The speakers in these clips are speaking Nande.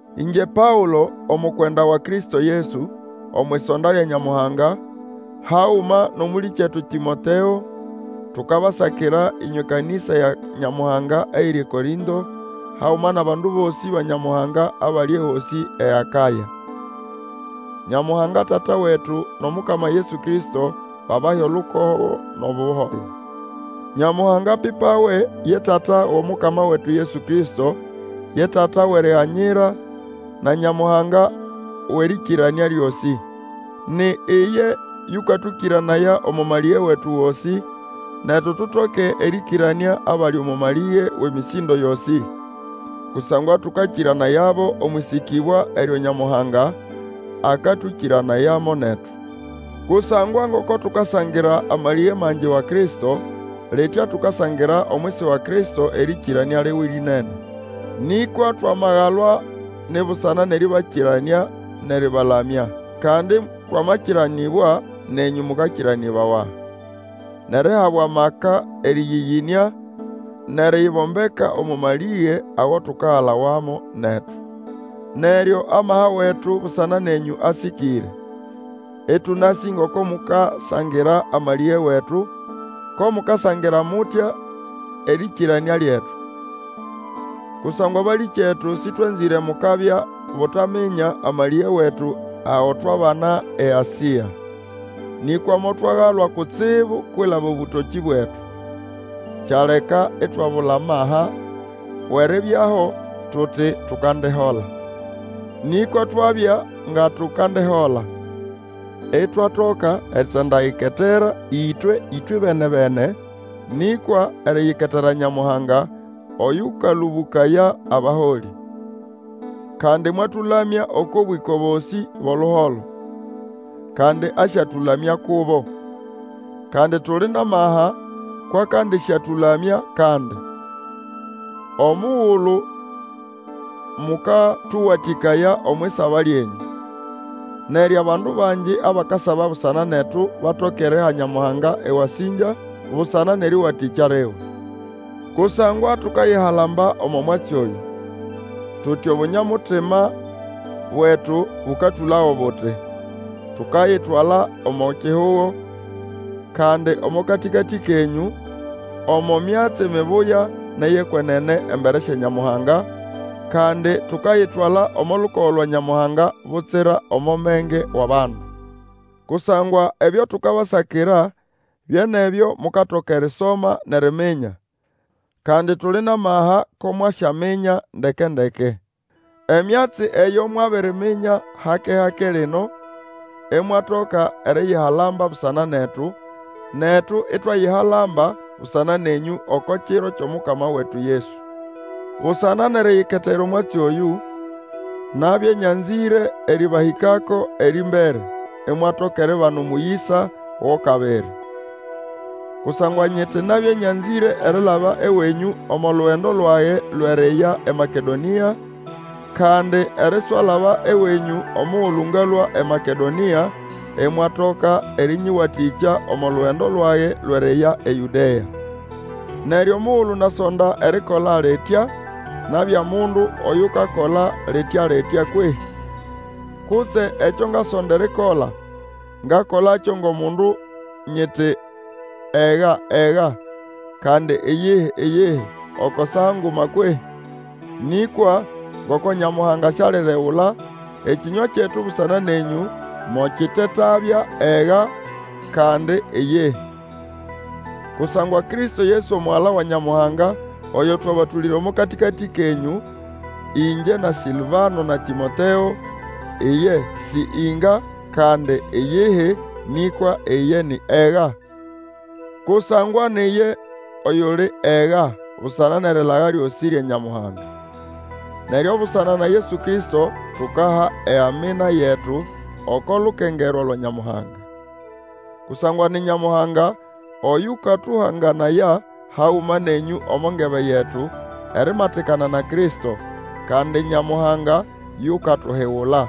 Ingye Paũlo, omukwenda wa Kristo Yesu, omwʼisonda lya Nyamuhanga, haguma nʼomũlĩkyetu Tĩmoteo, tukabasakira ĩnywe kanĩsa ya Nyamuhanga eyiri eKorĩnto haguma nʼabandu bosĩ ba Nyamuhanga abali ehosĩ eAkaya. Nyamuhanga Tata wetu nʼomukama Yesu Kristo babahe olukogo nʼobuholo. Nyamuhanga apipawe, ye Tata wʼOmukama wetu Yesu Kristo, ye Tata wʼeriganyira, na Nyamuhanga wʼerĩkĩranĩa lyosĩ. Ni iye yũkatũkĩranaya omo malĩge wetu gosĩ, netu tutoke erĩkĩranĩa abali omo malĩge wʼemĩsĩndo yosĩ. Kusangwa tũkakĩranayabo omwʼĩsĩkĩbwa eryo Nyamuhanga akatũkĩranayamo netu. Kusangwa ngoko tukasangira amalĩge mangi wa Kristo, litya tukasangira omwisi wa Kristo erĩkĩranĩa liwe lĩnene. Nĩkwa twamagalwa ni busana nʼerĩbakĩranĩa nʼerĩbalamya. Kandi twamakĩranĩbwa nenyũ mũkakĩranĩbawa, nʼerihabwa amaka erĩyĩyĩnĩa nʼeriyibombeka omo malĩge ago tukagalawamo netu. Neryo amaha wetu busana nenyũ asĩkĩre, ĩtũnasĩ ngoko mukasangira amalĩge wetu, ko mukasangira mutya erĩkĩranĩa lyetu. Kusangwa balĩkyetu, sĩtwanzĩre mukabya butaminya amalĩge wetu ago twabana eAsĩa. Nĩkwa motwagalwa kutsibu kwilaba obũtokĩ bwetu, kyaleka itwabula amaha wʼeribyaho, tuti tukandihola. Nĩkwa twabya nga tukandihola, itwatoka eritindayiketera twe ĩtwebene-bene, nĩkwa eriyiketera Nyamuhanga oyũkalũbũkaya abaholĩ. Kandi mwatũlamya oko bwĩko bosĩ bwʼoluholo, kandi asyatũlamya kubo; kandi tuli nʼamaha kwʼakandĩsyatũlamya kandi, omugulu mukatũwatĩkaya omwʼisaba lyenyũ. Neryo abandu bangi abakasaba busana netu batoke eriha Nyamuhanga ewasĩngya busana nʼerĩwatĩkya liwe. Kusangwa tukayihalamba omo mwatsi oyũ: tuti Obunya-mutima bwetu bũkatũlago buti, tukayitwala omo kihugo, kandi omo katĩkatĩ kenyũ, omo myatsi mibuya nʼeyʼekwenene embere sya Nyamuhanga, kandi tukayitwala omo lukogo lwa Nyamuhanga butsira omo menge wʼabandu. Kusangwa ebyo tukabasakira bye nʼebyo mukatoka erisoma nʼeriminya, kandi tuli nʼamaha ko mwasyaminya ndeke-ndeke. Emyatsi eyo mwabiriminya hake-hake lino, imwatoka eriyihalamba busana netu, netu itwayihalamba busana nenyũ oko Kiro kyʼomukama wetu Yesu. Busana nʼeriyiketera omwatsi oyũ, nabya nyanzĩre erĩbahĩkako erĩmbere, imwatoka eribana omũyĩsa go kabiri. Kusangwa nyiti nabya nyanzĩre erilaba ewenyũ omo lugendo lwage lwʼeriya eMakedonĩa, kandi eriswalaba ewenyũ omugulu ngalũa eMakedonĩa, imwatoka erĩnyĩwatĩkya omo lugendo lwage lwʼeriya eYũdea. Neryo omugulu nasonda erikola litya, nabya mundu oyukakola litya-litya kwehĩ? Kutse ekyo ngasonda erikola ngakolakyo ngʼomundu nyiti ega ega, kandi iyihi, iyihi, oko saa nguma kwehĩ? Nĩkwa ngoko Nyamuhanga sialiregula, ekĩnywa kyetu busana nenyũ mokitetabya ega, kandi iyihi. Kusangwa Kristo Yesu Omugala wa Nyamuhanga, oyo twabatũlĩra omo katĩkatĩ kenyũ, ĩngye, na Sĩlvano, na Tĩmoteo, iye si inga, kandi iyihi, nĩkwa iye ni Ega. Kusangwa ni iye oyuli Ega busana nʼerilaga lyosĩ lya Nyamuhanga. Neryo busana na Yesu Kristo tukaha eAmina yetu, oko lukengerwa lwa Nyamuhanga. Kusangwa ni Nyamuhanga oyũkatũhanganaya haguma nenyũ omo ngebe yetu, erimatikana na Kristo, kandi Nyamuhanga yukatuhigula.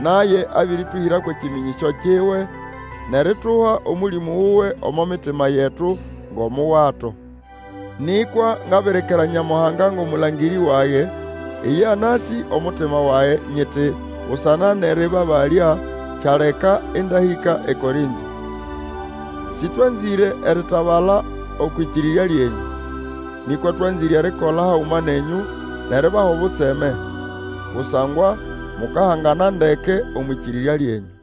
Naye abĩrĩtũhĩra kwʼekĩmĩnyĩsyo kiwe, nʼerituha Omũlĩmũ wuwe omo mitima yetu ngʼomuwato. Nĩkwa ngabirikira Nyamuhanga ngʼomũlangĩrĩ wage, iye anasĩ omutima wage, nyiti, busana nʼerĩbabalya kyaleka ĩndahĩka eKorĩnto. Sĩtwanzĩre eritabala okwʼĩkĩrĩrya lyenyũ. Nĩkwa twanzĩre erikola haguma nenyũ, nʼeribaha obutseme; kusangwa mukahangana ndeke omwʼĩkĩrĩrya lyenyũ.